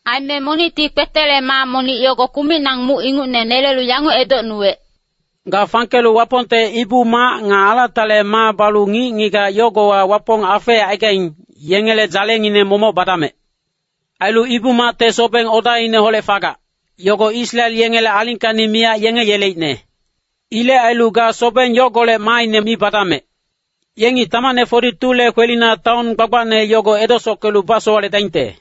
Aime monicti kpetele maa monic yogo kumicnang muc ingucne nelelu yanguc edocnuwec, “Ga fangkelu Wapongte Ibu-mac nga alatale maa balu ngic-ngigac yogowa Wapong afeecaigaing, yengele dzalengineng momoc badamec. Ailu Ibu-macte sobeng odaineholec fagac, yogo Israel yengele alingkacni miyac yenge yeleicne. Ilec ailu ga sobeng yogolec maaine mi badamec. Yengi tamacne 42le kwelina taon gbagbacne yogo edesockelu basowaledaingte.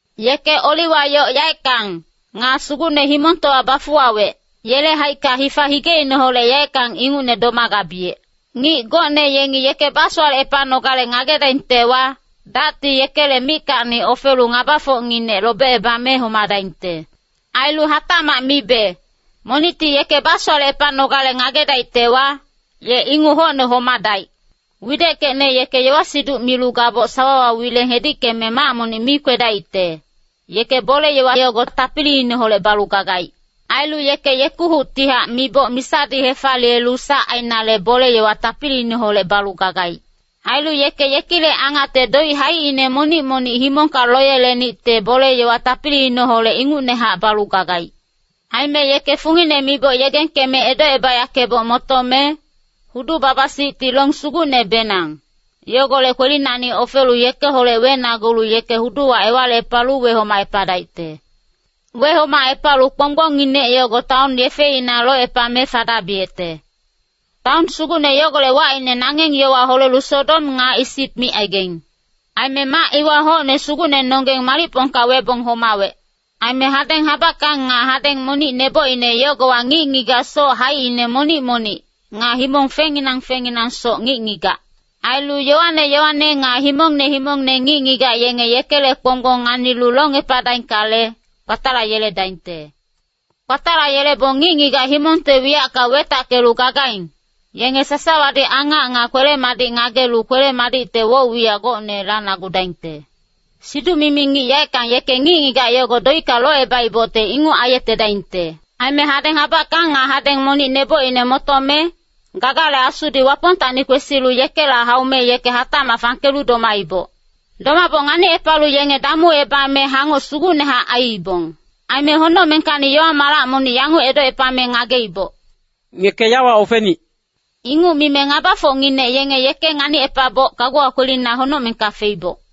Yeke oliwa yoc yaeckang, nga Sugucne himongtowa bafuwawec, yele haicka hifa higeineholec yaeckang ingucne domagabiyec. Ngic gocne yengi yeke basowalecepanogale ngagedaingtewa, dacti yekele mickacni ofelu ngabafocnginec lobecebame homadaingte. Ailu hatacmac mibe, monicti yeke basowalecepanogale ngagedaictewa, ye inguc hocne homadaic. Wideckecne yeke yowa-siduc milu gaboc sawawa wileng hedickeme mac monic mi kwedaicte, yeke bole-yowa yogo tapiliineholec balu gagaic. Ailu yeke yekuhuctihac miboc misadi hefaliyelu sac ainale bole-yowa tapiliineholec balu gagaic. Ailu yeke yekilec angacte doic haicine monic-monic himongka loyelenicte bole-yowa tapiliineholec ingucnehac balu gagaic. Aime yeke fungine miboc yegengkeme edocebayackeboc motome, hudu-baba-sicti long sugucnebenang, yogolec kwelinacni ofelu yekeholec wenagulu yeke huduwa ewalicepalu wehomacepadaicte. Wehomacepalu kponggbongnginec yogo taon yefeina locepame fadabiyecte. Taon sugucne yogolec wacine nangeng yowa holelu Sodom nga Isip micaigaing. Aime mac iwa hocne Sugucnenonggeng malicpongka webong homawec. Aime hadeng habackang nga hadeng monic nebocine yogowa ngic-ngigac soc haicine monic-monic, nga himong fengnginang fengnginangsoc ngic-ngigac. Ailu yowane yowane nga himongne himongne ngic-ngigac yenge yekele kponggbong nganilu longepadaingkale, kpatalayeledaingte. Kpatalayelebong ngic-ngigac himongte wiyacka wetackelu gagaing, yenge sasawadi angac nga kwele-madic ngagelu kwele-madicte woc-wiyac gocne lanagudaingte. Siduc-mimi ngic yaeckang yeke ngic-ngigac yogo doicka locebaibocte inguc aiyetedaingte. Aime hadeng habackang nga hadeng monic nebocine motome, gagale asudi Wapongtacni kwesilu yekela haume yeke hatacmac fangkelu domaiboc. Domaboc nganicepalu yenge damuebame hangoc sugucnehac aiibong. Aime honocmengkacni yowa-malac monic yanguc edocepame ngageiboc, “Ngeke yawa ofenic!” Inguc mime ngabafocnginec yenge yeke nganicepabong kaguwa kwelina honocmengka feiboc.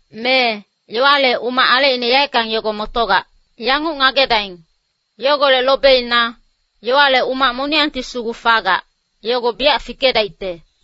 Mee, yowale umac alecine yaeckang yogo motogac. Yanguc ngagedaing, yogolec lobeina, yowale umac moniyangti sugu fagac, yogo biyac fikedaicte.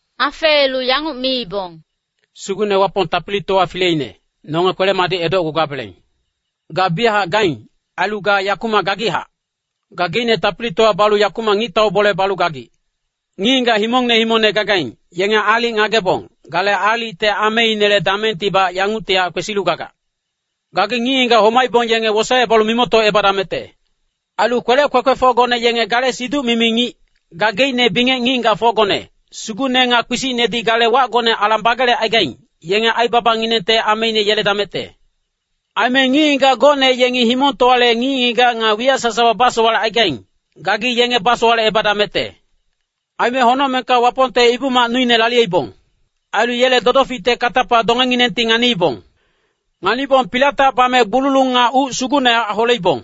Afeelu yanguc miibong, “Sugucne Wapong Tapilitowa Fileine, nonge kwele-madic edocgugabeleng. Ga biyachac gaing, ailu ga yakumac gagichac. Gageicne tapilitowa balu yakumac ngictau bole balu gagic. Ngic-ngigac himongne himongne gagaing, yenge aalic ngagebong, gale aalicte ameinele damengtibac yanguctihac kwesilu gagac. Gagi ngic-ngigac homaibong yenge wosaecebalu mimoctocebadamecte. Ailu kwelec kwekwefocgone yenge gale siduc-mimi ngic, gageicne bingec ngic-ngigacfocgone, sugucne nga kpisicnedi gale wacgone alang bagelecaigaing, yenge aibabanginengte ameine yeledamecte. Aime ngic-ngigac gocne yengi himongtowale ngic-ngigac nga wiyac sasawa basowalecaigaing, gagi yenge basowalecebadamecte.” Aime honocmengka Wapongte Ibu-mac nuine laliyeibong. Ailu yele dodoficte katapa dongenginengti nganiibong. Nganibong pilatac bame gbululung nga uc sugucnehac holeibong.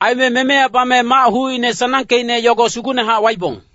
Aime memeya bame mac hucine sanangkeicne yogo sugucnehac waibong.